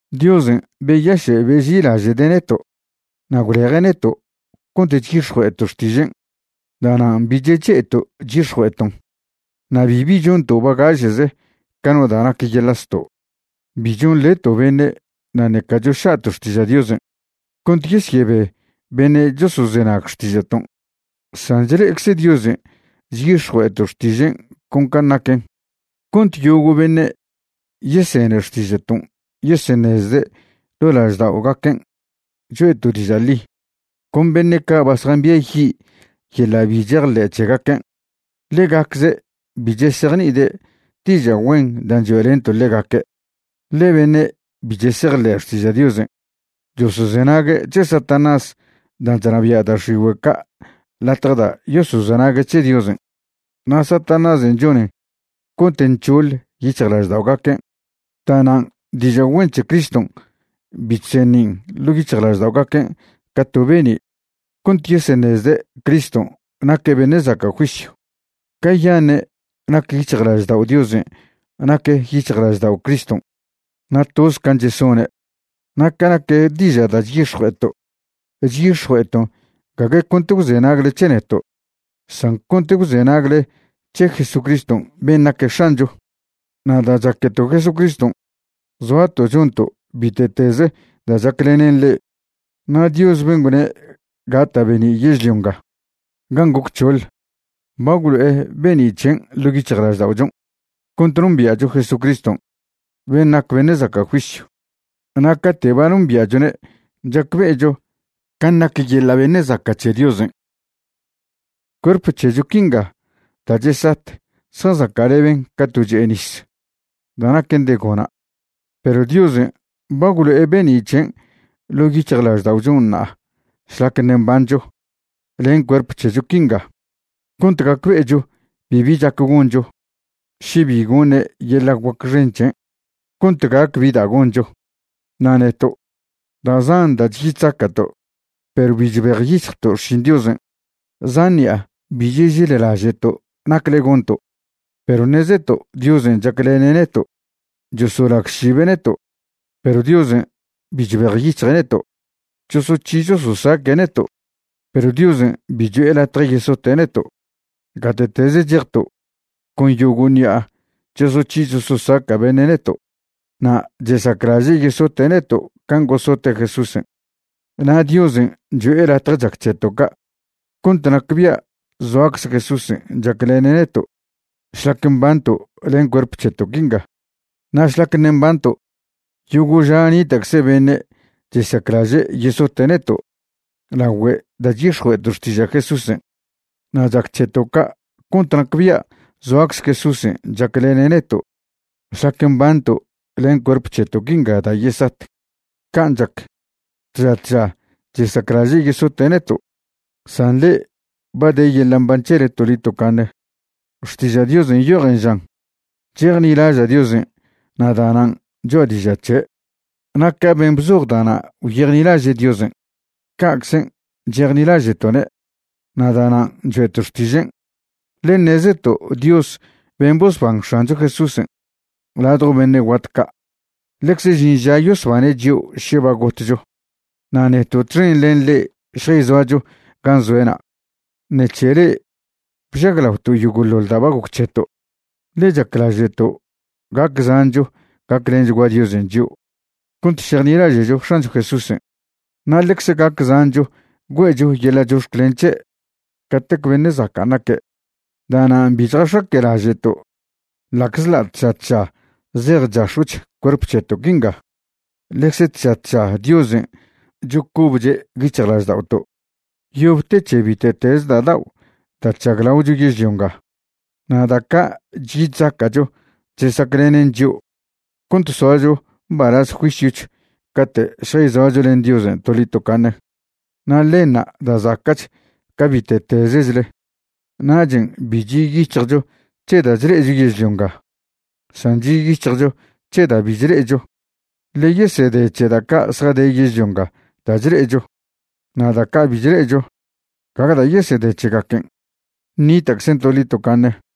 Diosen' beyaše' beži'ilaže'de' neto' na' gwleje' neto' cont chyix̱jue'eto' xtižen'. Da'nan' bi cheche'eto' chyix̱jue'eton'. Na' bibi chonto' bagaše'ze ca no da' nac da' yeḻa' zto'. Bi chonḻeto' beṉe' na' ṉeca choša'to' xtiža' Diosen' cont yesyebe beṉe' chosozenag xtiža'ton'. San chle'ecze Diosen' chyix̱jue'eto' xtižen' con can' naquen cont yogo' beṉe' yesene xtiža'ton' yeseṉezde' ḻo' lažda'ogaquen' choe'to' diža' ḻi. Con beṉe' ca' ba zjambiayi' yeḻa' bi chejḻe' c̱hegaquen', ḻegacze' bi chesejni'ide' diža' güen dan' choe'lento' ḻegaque'. Ḻe beṉe' bi chesejḻe' xtiža' Diosen' chosozenague' c̱he Satanás dan' chnabia' da' x̱igüe' ca' latje da' yosozenague' c̱he Diosen', na' Satanásen' chonen cont nc̱hoḻ yic̱hjlažda'ogaquen'. Da'nan' diža' güen c̱he Criston' bi chseṉin' ḻo' yic̱hjlažda'ogaquen' ca to be'ni' cont yeseṉezde' Criston' naque' beṉe' zaca' juisyw. Cayaṉe' nac yic̱hjlaždao' Diosen' nac yic̱hjlaždao' Criston', na' toz can' chesone'. Na' ca nac diža' da' chyix̱jue'eto', chyix̱jue'eton' gague cont gwzenagle c̱he neto', san cont gwzenagle c̱he Jesucriston' ben' naque' X̱ancho. Na' da' chaqueto' Jesucriston', zoato' chonto' bite'teze da' chaclenen le'e. Na' Dios ben' gwne' gata' be'ni' yežlio nga gan' goc c̱hoḻ, ba gwlo'e be'ni' c̱hen' ḻo' yic̱hjlažda'ochon' cont nombia'cho Jesucriston' ben' nac beṉe' zaca' juisyw, na' cate' ba nombia'chone' chacbe'echo can' nac yeḻa' beṉe' zaca' c̱he Diosen'. Cuerp c̱hecho quinga da' chesat zjazaca'leben ca to che'e nis da' naquen de gona'. Perw Diosen' ba gwlo'e be'ni' c̱hen' ḻo' yic̱hjlažda'ochon' ṉa'a šlac ṉe' mbancho len cuerp c̱hecho quinga cont gacbe'echo bibi chac goncho še bi goṉe' yeḻa' guac xen c̱hen' cont gac bi da' goncho. Na' neto', da' zan da' chyi chzaca'to', perw bi chbejyic̱hjto' xšin Diosen'. Zan ṉi'a bi chežellaže'to' nacle gonto', perw ṉezeto' Diosen' chaclene' neto'. Chosolagšibe' neto', perw Diosen' bi chbejyic̱hje' neto'. Chosoc̱hi chososaque' neto', perw Diosen' bi cho'e latje yesote' neto'. Gate'teze chejto', con yogo' ṉi'a chosoc̱hi chososaca' beṉe' neto' na' chesaclaže' yesote' neto' can' gosote' Jesúsen'. Na' Diosen' cho'e latje chac c̱heto' ca' cont nacbia' zoacze Jesúsen' chaclene' neto' šlac mbanto' len cuerp c̱heto' quinga. Na' šlac ṉe' mbanto', yogo' ža nita'cze beṉe' chesaclaže' yesote' neto' lagüe' da' chyix̱jue'eto' xtiža' Jesúsen'. Na' chac c̱heto' ca' cont nacbia' zoacze Jesúsen' chaclene' neto' šlac mbanto' len cuerp c̱heto' quinga da' yesat. Can' chac, tža tža chesaclaže' yesote' neto', san le'e ba de yeḻa' mban c̱hele toḻi tocaṉe. Xtiža' Diosen' nyojen žan: “Chejnilaža' Diosen' na' da'nan' choa' diža' c̱he'.” Na' ca ben' bzoj da'na' gwyejnilaže' Diosen', ca'czen' chejnilaže'to'ne' na' da'nan' choe'to' xtižen'. Ḻe ṉezeto' Dios ben' bosban X̱ancho Jesúsen' ladjo beṉe' guat ca' ḻecze žin ža yosbane' chio' še ba gotcho, na' neto' txen len le'e šjayzoacho gan' zoe'na'. Ṉec̱he le'e bžaglaoto' yogo'ḻoḻ da' ba goc c̱heto'. Ḻe chaclaže'to' gac zancho gaclenchgua Diosen' chio' cont šejnilaže'cho X̱ancho Jesúsen', na' ḻecze gac zancho güe'cho yeḻa' chox̱clen c̱he' catec beṉe' zacan' naque'. Da'nan' bi chjax̱aque'laže'to'. Ḻa'czḻa' tža tža zej chax̱o'ch cuerp c̱heto' quinga, ḻecze tža tža Diosen' chocobche' yic̱hjlažda'oto'. Yob te c̱he bite'teze da' dao' da' chžaglaocho yežlio nga. Na' da' ca' chyi chzaca'cho chesaclenen chio' cont soacho mbalaz juisyoch cate' šjayzoacho len Diosen' toḻi tocaṉe, na' ḻenṉa' da' zaca'ch ca bite'tezchle. Nachen' bi chi' yic̱hjcho c̱he da' chle'echo yežlio nga, san chi' yic̱hjcho c̱he da' bi chle'echo. Ḻe yesede c̱he da' ca' zjade yežlio nga da' chle'echo, na' da' ca' bi chle'echo, gague da' yesede c̱hegaquen, ṉita'czen toḻi tocaṉe.